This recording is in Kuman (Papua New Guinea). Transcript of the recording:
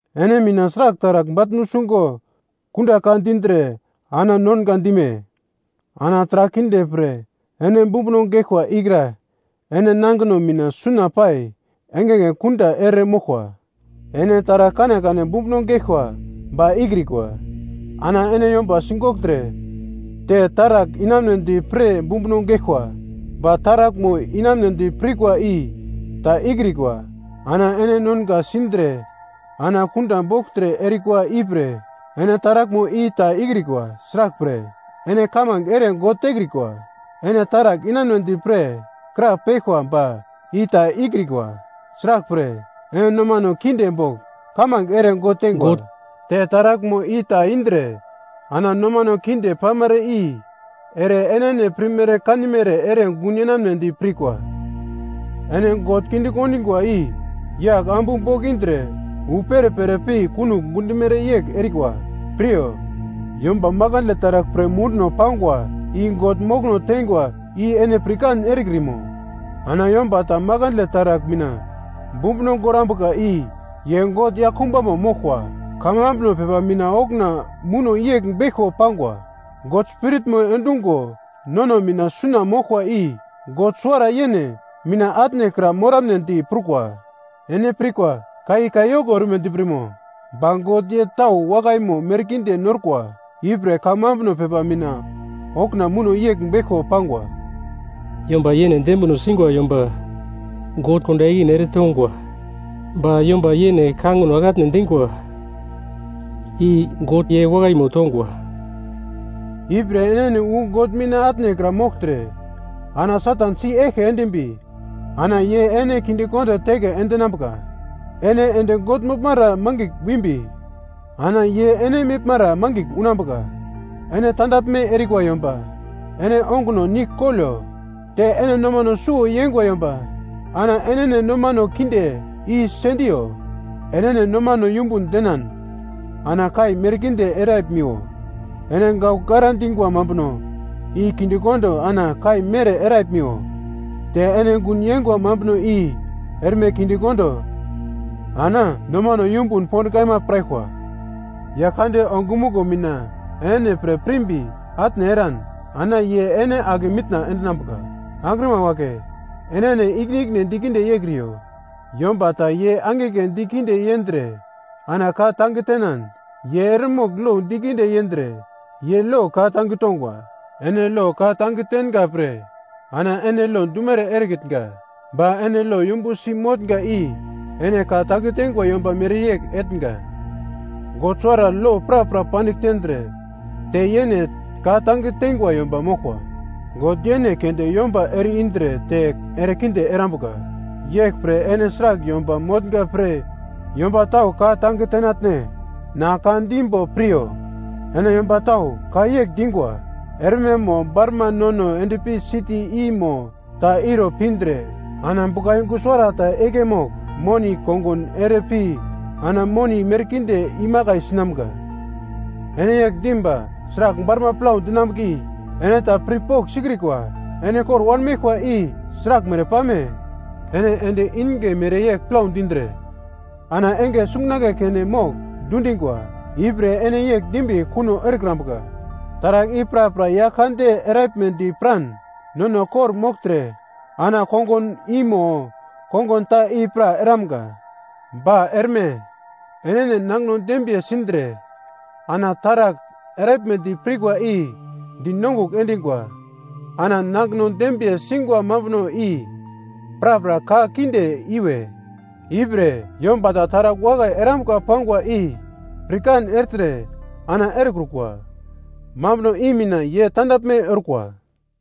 Ene mina sragl taragl bagl nusungo kunda ka dindre ana nonga dime? Ana taragl kinde pre ene bumbuno geglkwa ikra ene nangino mina suna pai engenge kunda ere moglkwa. Ene taragl kanekane bumbuno geglkwa ba ikrikwa. Ana ene yomba sigogltre te taragl inamunedi pre bumbuno geglkwa, ba taraglmo inamunedi pirkwa i ta ikrikwa ana ene nonga sindre ana kunda bogltre erikwa ipre ene taraglmo i ta ikrikwa. Sraglpre, ene kamange ere God tekrikwa. Ene taragl inamunedi pre krapeglkwa ba i ta ikraglkwa, sraglpre, ene nomane kinde bogl kamange ere God tengwa. Te taraglmo i ta indre ana nomane kinde pamere i ere enene pirmere kanimere ere gun yenamnedi pirkwa. Ene God kinde kondingwa i yagl ambu bogl indre wu perepere pi kunogl gundimere yegl erikwa. Piryo, yomba makandle taragl pre munduno pangwa i God mokono teingwa i ene pirkan erekrimo? Ana yomba ta makandle taragl mina bumbuno gorambuka i ye God yaglkumbamo moglkwa. Kamambuno pepa mina okuna muno yegl beglko pangwa. God Spiritmo endungo nono mina suna moglkwa i God suwara yene mina atnekra morambedi prukwa. Ene pirkwa ka i kayoko ormedi pirmo? Ba God ye tau wakaimo merkinde norkwa. Ipre kamambuno pepa mina okuna muno yegl beglko pangwa: “Yomba yene dembino singwa yomba God kunda ikine eretongwa ba yomba yene kangino ake atne endingwa i God ye wakaimo tongwa.” Ipre enene wu God mina atnekra mogltre, ana Satan si-eglke endimbi ana ye ene kindekondo teke endinambuka. Ene ende God moglmara mangigl wimbi ana ye ene meglmara mangigl unambuka. Ene tandaglme erikwa yomba ene onguno nigl kolo. Te ene noman suwo yeingwa yomba ana ene nomano kinde i sendiyo. Enene nomano yumbun denan ana kai merkinde eraglimiwo. Ene gaugl gara dingwa mambuno i kinde kondo ana kai mere eraglimiwo. Te ene gun yeingwa mambuno i erme kinde kondo ana nomano yumbun pond kaima piraglkwa. Yaglkande ongumuglo mina enene pre pirimbi atne eran ana Ye ene ake mitna endinambuka. Angrima wagle enene ikine-ikine dikinde yeikriyo. Yomba ta ye angigle dikinde yendre ana ka-tange tenan ye eremogl lo dikinde yendre ye lo ka-tange tongwa. Ene lo ka-tange tenga pre ana ene lo dumere erekitnga ba ene lo yumbu si motnga i ene ka tange teingwa yomba mereyegl etnga. God suwara lo prapra pandigl tendre te yene ka tange teingwa yomba moglkwa. God yene keunde yomba ere-indre te erekinde erambuka. Yeglpre ene sragl yomba motnga pre yomba tau ka-tange tenatne? Na ka dimbo piryo. Ene yomba tau ka yegl dingwa, “Erme mo barma nono endpi siti i mo ta iro pindre ana buglayungu suwarata igle mogl moni kongun ere pi ana moni merkinde imakai sinamga.” Ene yegl dim ba sragl barma plau dinambuka i ene ta pirpogl sikrikwa. Ene kor wanmeglkwa i sraglmere pame! Ene endi inge mereyegl plau dindre ana enge sungunagle keme mogl dundingwa. Ipre ene yegl dimbi kuno erambuka, “Taragl i prapra Yaglkande eraglmedi piran nono kor-mogltre ana kongun i mo kongun ta i pra eramga.” Ba erme enene nangino dembiye sindre ana taragl eramnedi pirkwa i dinongugl endingwa. Ana nangino dembiye singwa mambuno i prapra ka kinde iwe. Ipre yomba ta taragl wakai erambuka pangwa i pirkan ertre ana erekrukwa mambuno i mina ye tandaglme orkwa.